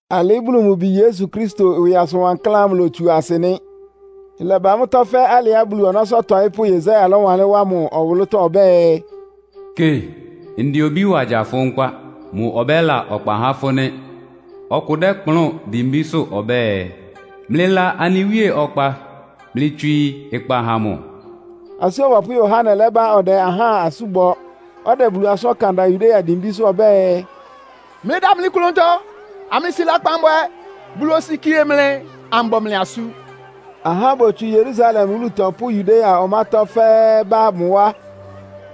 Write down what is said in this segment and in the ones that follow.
Alɩ́ Bulu mʋ Bi Yesu Kristo ɩwɩ asʋn wankláán ámʋ ilotsuá asɩ nɩ́. Ɩlɛba mʋ́tɔ́ fɛ́ alɩá Bulu ɔnɔ́sʋ́ ɔtɔɩ́pʋ́Yesaia lɔ́wanlɩ́n wá mʋ ɔwʋlʋ́tɔ́ ɔbɛ́ɛ, “Kɩ, ndɛ obí wa gya fʋ nkpá. Mʋ ɔbɛ́la ɔkpa há fʋ́ nɩ́. Ɔkʋ dɛ́kplʋn dimbísʋ́ ɔbɛ́ɛ, ‘Mlɩla anɩ Wíe ɔkpa. Mlɩtswii ɩkpa ha mʋ!’” Asú Ɔbɔpʋ́ Yohane lɛ́ba ɔdɛ ahá asú bɔ, ɔdɛ Bulu asʋ́n ɔkan da Yudea dimbísʋ́ ɔbɛ́ɛ, “Mlɩdamli klʋntɔ, amlɩsi lakpan bwɛ. Bulu osikie mlɩ, ambɔ mlɩ asú.” Ahá botsu Yerusalem wúlutɔ pʋ́ Yudea ɔmátɔ́ fɛ́ɛ́ bá mʋ wá.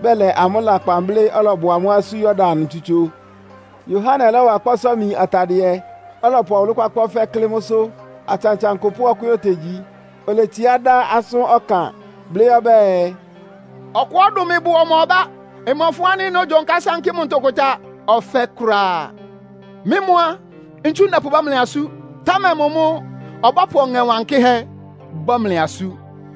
Bɛlɛ amʋ́ lakpan blɩ́, ɔlɔbɔ amʋ́ asú Yordan ntsutso. Yohane lɔ́wa kpɔ́sɔ́-imi atadɩɛ, ɔlɔpʋ ɔwʋlʋ́-kpákpá ɔfɛ́ klɩ́ mʋ́sʋ́. Atsantsankʋ pʋ́ ɔkwɛ́n otegyi. Oletsiá dá asʋ́n ɔkan, blɩ́ ɔbɛ́ɛ, “Ɔkʋá ɔdʋn mɩ bʋ ɔma ɔbá. Mmɔfʋn ánɩ́ nógyonká sánkɩ́ mʋ ntʋkʋta ɔfɛ́ kʋ́ráá. Mɩ́ mʋ́ á, ntsu ndɛpʋbɔ́ mlɩ asú, támɛ mʋ mʋ́ ɔbɔ́pʋ Ɔŋɛ Wankɩ́hɛ́ bɔ́ mlɩ asú.”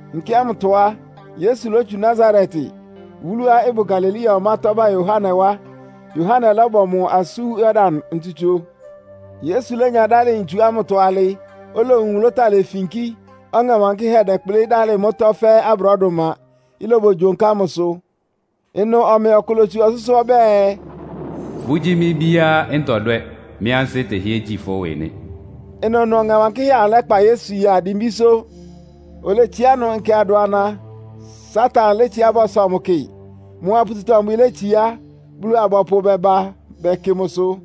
Nkɛ ámʋtɔ á, Yesu lótsu Nasaret, wúluá ɩbʋ Galilea ɔmátɔ́ ba Yohane wá, Yohane lɔ́bɔ mʋ asú Yordan ntsutso. Yesu lénya dálɩ ntsu ámʋtɔ alɩ, olowun nwʋlʋ́táa lefinkí, Ɔŋɛ Wankɩ́hɛ́ dɛ́kplɩ́ dalɩ mʋ́tɔ́ fɛ́ abrɔ́dʋma, ɩlobogyonká mʋsʋ. Ɩnʋ ɔmɛ kʋ lótsu ɔsʋ́sʋ́ ɔbɛ́ɛ, “Fʋ́gyí mɩ́ bíá ntɔdwɛ́, mɩ ansɩ́ tɛhɩ́ɛ́ gyí fʋ́ ɩwɩ nɩ́.” Ɩnʋnʋ Ɔŋɛ Wankɩ́hɛ́ amʋ lɛ́kpa Yesu ya dimbísʋ́. Oletsiá ɩnʋ nkɛ adʋana, Satan létsiá bɔsɔ mʋ kɩ. Mʋa pututɔ-mbwɩ létsiá, Bulu-abɔpʋ bɛba bɛkɩ mʋsʋ.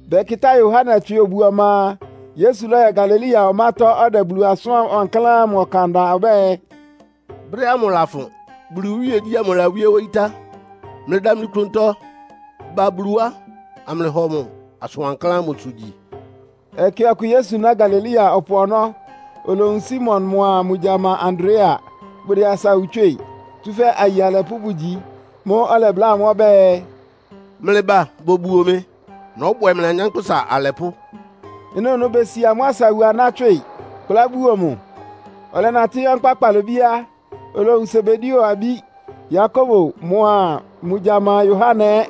Bɛkɩtá Yohane tswɩ obu ɔma a, Yesu lɔ́yɔ Galilea ɔmátɔ́, ɔdɛ Bulu asʋn wankláán ámʋ ɔkan da. Ɔbɛ́ɛ, “Brɛ́ ámʋ lafʋn. Bulu iwíegyí ámʋ lawíé wóyí tá. Mlɩdamli klʋntɔ ba Bulu wá, amlɩhɔ mʋ asʋn wankláán ámʋsʋ gyi.” Ɛkɛ ɔkʋ Yesu ná Galilea ɔpʋ ɔnɔ́, olowun Simon mʋa mʋ gyama Andrea. Bʋdɛ asawu tswɩ́ɩ, tsúfɛ́ aye alɛpʋ́ bʋgyi. Mʋ́ʋ́ ɔlɛbláa amʋ́ ɔbɛ́ɛ, “Mlɩba bobuo mɩ. Nɔ́bwɛ mlɩ anyánkpʋ́sa alɛpʋ́.” Ɩnʋnʋ besi amʋ́ asawu aná tswɩ, kplá buo mʋ. Ɔlɛnatɩ́ yɔ́ nkpá kpalobí á, olowun Sebedeo abí, Yakobo mʋa mʋ gyama Yohane ɛ́.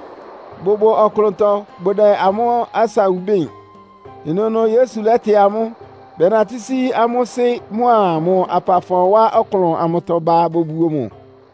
Bʋbʋ ɔklʋntɔ, bʋdɛ amʋ́ asawu bɩ́ɩn. Ɩnʋnʋ Yesu lɛ́tɩ amʋ́ ɛ́, bɛnatɩ́ sí amʋ́ sɩ́ mʋ́a mʋ apafɔ wá ɔklʋn amʋtɔ ba bobuo mʋ.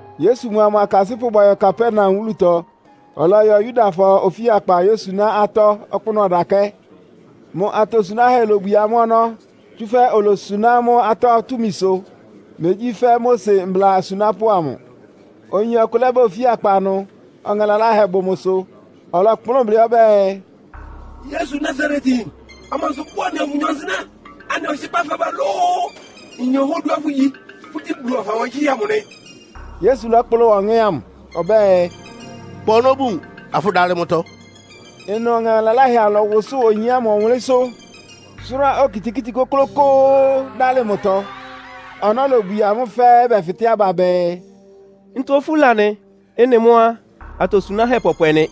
Yesu mʋa mʋ akasɩ́pʋ́ bɔyɔ Kapernaum wúlutɔ. Ɔlɔyɔ Yudafɔ ofíakpa yósuná atɔ́ ɔkpʋ́nʋ́ ɔdakɛ́. Mʋ atosunáhɛ́ lobwie amʋ́ ɔnɔ́, tsúfɛ́ olosuná amʋ́ atɔ́ túmisʋ. Megyí fɛ́ Mose mbla asunápʋ́ amʋ. Oyin ɔkʋ lɛ́ba ofíakpa ɩnʋ, ɔŋɛ laláhɛ bʋ mʋsʋ. Ɔlɔkplʋ́n blɩ́ ɔbɛ́ɛ, “Yesu Nasaretyin, amansʋ bʋ́ʋ anɩa fʋnyɔ nsɩnɛ́? Anɩ ɔhɩkpá fɛbá lóó? Nyin ɔhá oduá fʋgyi. Fʋ́gyí Bulu Ɔha Wankɩ́hɛ́ amʋ nɩ!” Yesu lɔ́kplʋn wa ɔŋɛ́ ámʋ ɔbɛ́ɛ, “Kpa ɔnɔ́ bun, afʋdalɩ mʋtɔ.” Ɩnʋ ɔŋɛ laláhɛ amʋ lɔ́wʋsʋ́ʋ oyin ámʋ ɔwʋnlɩ́nsʋ́, sʋ́rá okitikíti kʋ́klʋ́kʋ́ʋ́, dálɩ mʋtɔ. Ɔnɔ́ lobwie amʋ́ fɛ́ɛ́, bɛfɩtɛ́ aba bɛɛ, “Ntɔ ofúla nɩ? Ɩ́nɩ mʋ́ á, atosunáhɛ́ pɔpwɛ nɩ.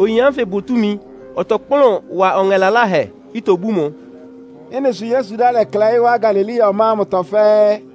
Oyin ánfɩ bʋ túmi, ɔtɔkplʋ́n wa ɔŋɛ laláhɛ, itobú mʋ.” Ɩ́nɩ sʋ Yesu ɩdá lɛklɛɩ́ wá Galilea ɔmá ámʋtɔ fɛ́ɛ́.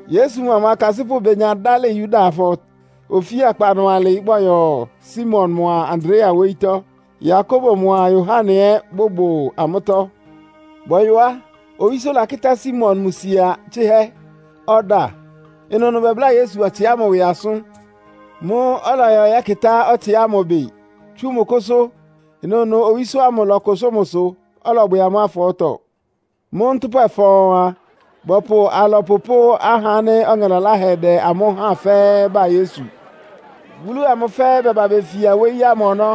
Yesu mʋa mʋ akasɩ́pʋ́ benya dálɩ Yudafɔ ofíakpa ɩnʋ alɩ, bɔyɔ Simon mʋa Andrea wóyítɔ́. Yakobo mʋa Yohane ɛ́ bʋbʋ amʋ́tɔ́. Bɔyɔ á, owísó lakɩ́tá Simon mʋ sia tsɩ́hɛ́, ɔda. Ɩnʋnʋ bɛbláa Yesu ɔtsɩ ámʋ ɩwɩ asʋ́n. Mʋ́ʋ́ ɔlɔyɔ yɛ́kɩtá ɔtsɩ ámʋ ɩbɩ, tsú mʋ kʋ́sʋ́. Ɩnʋnʋ owísó ámʋ lɔ́kʋsʋ́ mʋsʋ, ɔlɔbwɛ amʋ́ afɔɔ́tɔ. Mʋ́ ntʋ́pwɛ fɔɔn a, bɔpʋ alɔpʋ pʋ́ ahá ánɩ́ ɔŋɛ laláhɛ dɛ amʋ́ háan fɛ́ɛ́ ba Yesu. Wúlu amʋ fɛ́ɛ́ bɛba befia wóyí ámʋ ɔnɔ́.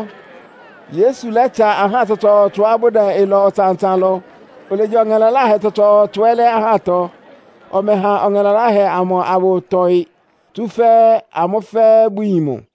Yesu lɛ́tsa ahá tsɔtsɔɔtsɔá bʋdɛ ɩlɔ ɔtsan-ɔtsan lɔ, olegya ɔŋɛ laláhɛ tsɔtsɔɔtsɔ ɛ́ lɛ́ ahátɔ. Ɔmɛha ɔŋɛ laláhɛ amʋ abʋtɔɩ, tsúfɛ́ amʋ́ fɛ́ɛ́ bʋyin mʋ.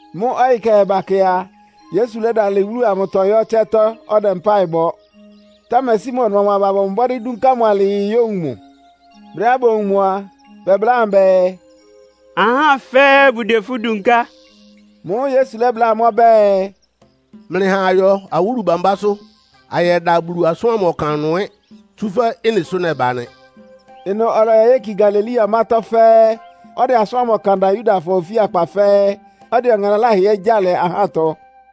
Mʋ́ ɔyɩ kɛhɛ bakɛ a, Yesu lɛ́dalɩ wúlu amʋtɔ yɔ ɩtsɛ́tɔ́ ɔdɛ mpáɩ bɔ. Támɛ Simon mʋa mʋ aba bɔbɔ mbɔ́dɩ́ dúnká mʋ alɩɩ yówun mʋ. Brɛ́á bowun mʋ a, bɛbláa mʋ bɛɛ, “Ahá fɛ́ɛ́ bʋdɛ fʋ́ dunká.” Mʋ́ʋ́ Yesu lɛ́bláa amʋ́ ɔbɛ́ɛ “Mlɩha ayɔ awúlu bámbásʋ́, anyɛda Bulu asʋ́n ámʋ ɔkan ɩnʋ ɛ́, tsúfɛ́ ɩ́nɩ sʋ nɛba nɩ.” Ɩnʋ ɔlɔyɔ yéki Galilea ɔmátɔ́ fɛ́ɛ́, ɔdɛ asʋ́n ámʋ ɔkan da Yudafɔ ofíakpa fɛ́ɛ́, ɔdɛ ɔŋɛ laláhɛ ɛ́ gyáa lɛ ahátɔ.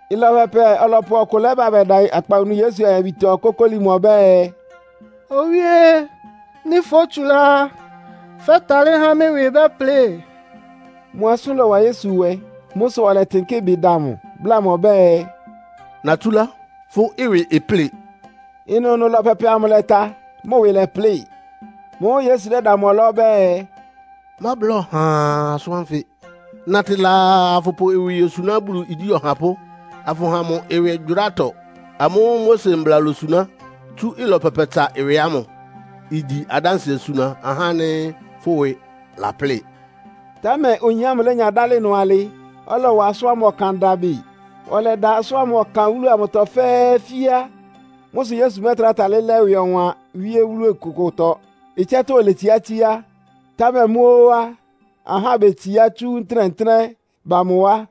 Ɩlɔ pɛpɛ ɔlɔpʋ́ ɔkʋ lɛ́ba bɛda akpawunu Yesu ayabitɔ, kókóli mʋ ɔbɛ́ɛ, “Owíé! Nɩ́ fótsulá á, fɛ́talɩ́ há mɩ́ ɩwɩ bɛ́plɩ.” Mʋ asʋ́n lɔ́wa Yesu nwɛ. Mʋ́ sʋ ɔlɛtɩnkɩ́ ɩbɩ da mʋ, bláa mʋ ɔbɛ́ɛ, “Natsúlá, fʋ́ ɩwɩ ɩplɩ́ɩ!” Ɩnʋnʋ ɩlɔ pɛpɛ amʋ ɩlɛta, mʋ ɩwɩ lɛ́plɩ. Mʋ́ʋ́ Yesu lɛ́da mʋ ɔlá ɔbɛ́ɛ, “Mábla ɔhaa asʋ́n ánfɩ. Natɩ laa afʋpʋ fʋ́ ɩwɩ yosuná Bulu igyí ɔhapʋ́, afʋha mʋ ɩwɩgyʋrátɔ amʋ́ʋ́ Mose mbla lósuná tsú ɩlɔ pɛpɛtsa ɩwɩ ámʋ. Igyi adánsɩɛ suna ahá ánɩ́ fʋ́ ɩwɩ laplɩ́ɩ.” Támɛ oyin ámʋ lénya dálɩ ɩnʋ alɩ, ɔlɔwa mʋ́ ɔkan da bɩ. Ɔlɛda asʋ́n ámʋ ɔkan wúlu amʋtɔ fɛ́ɛ́ fíá. Mʋ́ sʋ Yesu mɛ́tra talɩ́ lɛ́ ɩwɩ ɔwan wíé wúlu kʋkʋtɔ, ɩtsɛ́tɔ́ oletsiá tsíá. Támɛ mʋ́ ó á, ahá betsiá tsú ntɩ́nɛ́-ntɩ́nɛ́ ba mʋ wá.